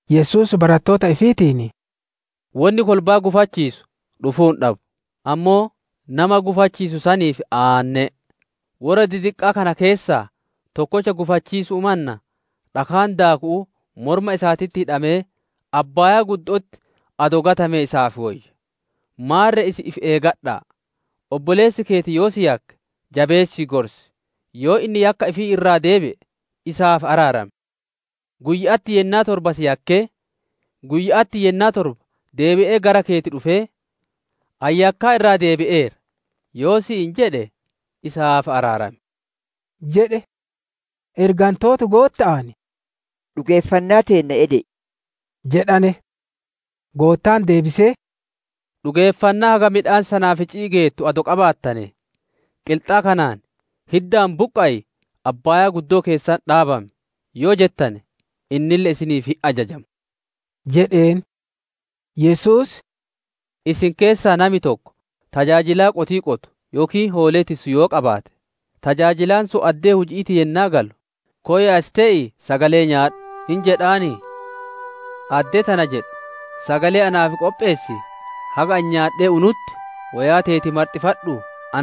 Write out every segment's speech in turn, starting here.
Yesuus barattoota ifiitiin, «Wonni kolbaa gufachiisu dhufuu hin dhaddu; ammoo nama gufachiisu saniif aanne'e! Worra didiqqaa kana keessaa tokkocha gufachiisu'uu mannaa, dhakaan daaku'uu morma isaatitti hidhamee abbaaya'atti adoo gatamee isaaf woyya. Maarre isin ifi eeggadha'a; obboleessi keeti yoo si yakke, jabeessii gorsi; yoo inni yakkaa ifii irraa deebi'e isaaf araaram. Guyya'atti yennaa torba si yakkee, guyya'atti yennaa torba deebi'ee gara keeti dhufee, ‹Ani yakkaa irraa deebi'eera› yoo si'iin jedhe isaaf araaram» jedhe. Ergantooti Gootta'aan, «Dhugeeffannaa teenna ede'i» jedhane. Goottaan deebisee, «Dhugeeffannaa haga midhaan sanaafici'ii geettu adoo qabaattanee, qilxaa kanaan, ‹Hiddaan buqqa'ii abbaayaa keessatti dhaabami!› yoo jettane, innille isiniif hin ajajama» jedheen. Yesuus, «Isin keessaa nami tokko tajaajilaa qotii qotu yookiin hoolee tissu yoo qabaate, tajaajilaan sun addee huji'iitii yennaa galu, ‹Koy as tee'ii sagalee nyaadhu!› hin jedhanii? Addee tana jedhu, ‹Sagalee naaf qopheessii, haga ani nyaadhee unutti woyaa teeti marxifadhuu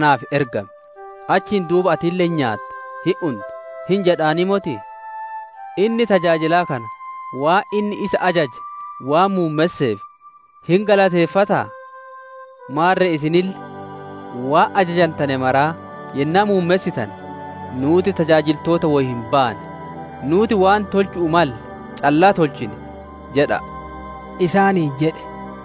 naaf ergami! Achiin duuba atille hin nyaata hin unta› hin jedhanii motii? Inni, tajaajilaa kana waan inni isa ajaje waan muummesseef hin galateeffataa? Maarre isinille waan ajajantane maraa yennaa muummessitane, ‹Nuuti tajaajiltoota woy hin baane; nuuti waan tolchu'uu malle callaa tolchine› jedha'a!» isaaniin jedhe.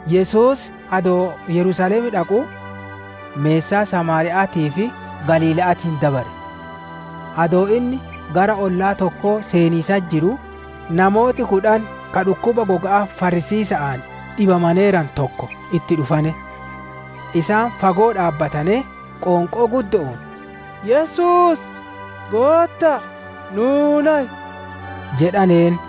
Yesuus adoo Yerusaalem dhaquu, meessaa Samaariya'aatii fi Galiila'aatiin dabare. Adoo inni gara ollaa tokkoo seeniisatti jiruu, namooti kudhan ka dhukkuba goga'aa farrisiisa'aan dhibamaneeranu tokko itti dhufane. Isaan fagoo dhaabbatanee, qoonqoo guddo'oon, «Yesuus! Gootta'a! Nuu nayi!» jedhaneen.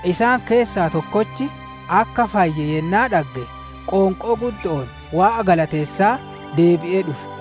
Isaan keessaa tokkochi akka fayye yennaa dhagge, qoonqoo guddo'oon Waaqa galateessaa, deebi'ee dhufe.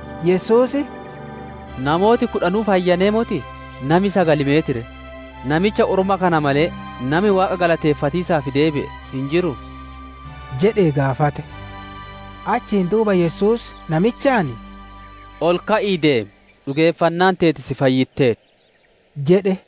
Yesuus, «Namooti kudhanuu fayyanee motii? Nami sagali meet ree? Namicha orma kana malee, nami Waaqa galateeffatiisaaf deebi'e hin jiruu?» jedhee gaafate. Achiin duuba Yesuus namichaan, «Ol ka'ii deemi; dhugeeffannaan teeti si fayyitteerti» jedhe.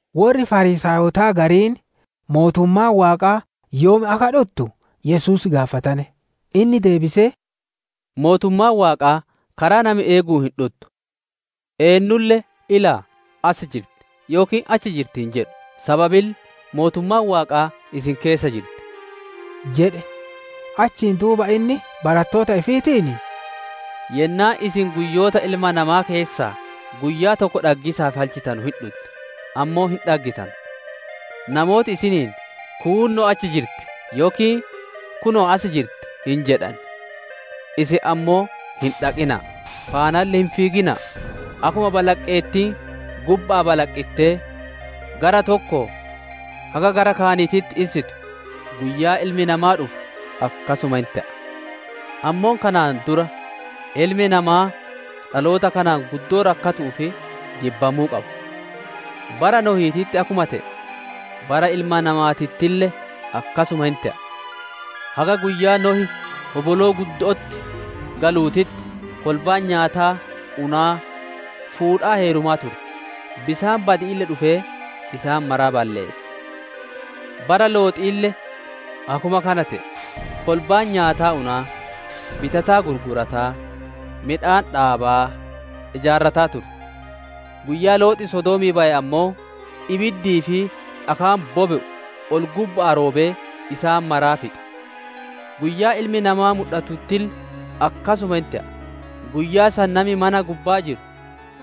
Worri Fariisaayotaa gariin mootummaan Waaqaa yoom akka dhuttu Yesuus gaafatane. Inni deebisee, «Mootummaan Waaqaa karaa nami eeguun hin dhuttu. Eennulle, ‹Ilaa, as jirti!› yookiin, ‹Achi jirti!› hin jedhu; sababille, mootummaan Waaqaa isin keessa jirti» jedhe. Achiin duuba inni barattoota ifiitiin, «Yennaan isin guyyoota Ilma Namaa keessaa, guyyaa tokko dhaggiisaaf halchitanu hin dhutti, ammoo hin dhaggitanu. Namooti isiniin, ‹Kuunnoo achi jirti!› yookiin ‹Kunoo asi jirti!› hin jedhan. Isin ammoo hin dhaqina'a; faanalle hin fiigina'a! Akkuma balaqqeettiin gubba'aa balaqqittee gara tokkoo haga gara kaaniititti issitu, guyyaa Ilmi Namaa dhufu akkasuma hin te'a. Ammoo kanaan dura, Ilmi Namaa dhaloota kanaan guddoo rakkatu'uu fi jibbamuu qaba. «Bara Nohiititti akkuma te'ee, bara Ilma Namaatittille akkasuma hin te'a. Haga guyyaa Nohi hoboloo guddo'otti galuutitti, kolbaan nyaataa unaa, fuudhaa heerumaa turte, bisaan badi'iille dhufee isaan maraa balleesse. Bara Looxiille akkuma kana te'e; kolbaan nyaataa unaa, bitataa gurgurataa, midhaan dhaabaa, ijaarrataa turte. Guyyaa Loox Sodoomii baye ammoo, ibiddii fi dhakaan bobe'u ol-gubba'aa roobee isaan maraa fixe. Guyyaa Ilmi Namaa mudhatuttille akkasuma hin te'a. «Guyyaa san nami mana gubbaa jiru,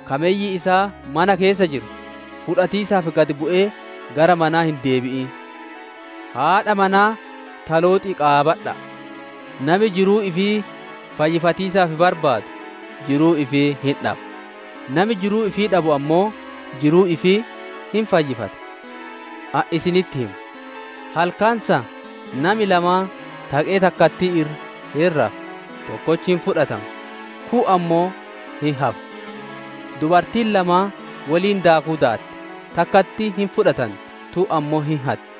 ka mey isaa mana keessa jiru, fudhatiisaaf gad bu'ee gara manaa hin deebi'in. Haadha manaa ta Looxii qaabadha'a! Nami jiruu ifii fayyifatiisaaf barbaadu jiruu ifii hin dhaba; nami jiruu ifii dhabu ammoo jiruu ifii hin fayyifata. Ani isinitti hima, halkan san nami lamaan taqee takkattii irra hin rafa, tokkochi hin fudhatama, kuun ammoo hin hafa. Dubartiin lamaan woliin daakuu daatti, takkattiin hin fudhatanti, tuun ammoo hin hatti.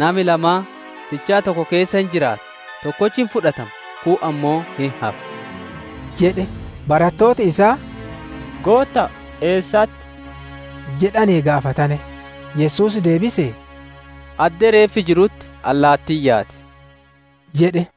[Nami lamaan fichaa tokko keessa hin jiraata, tokkochi hin fudhatama, kuun ammoo hin hafa]» jedhe. Barattooti isaa, «Gootta'a, eessatti?» jedhanee gaafatane. Yesuus deebisee, «Addee reeffi jirutti allaatiin yaati» jedhe.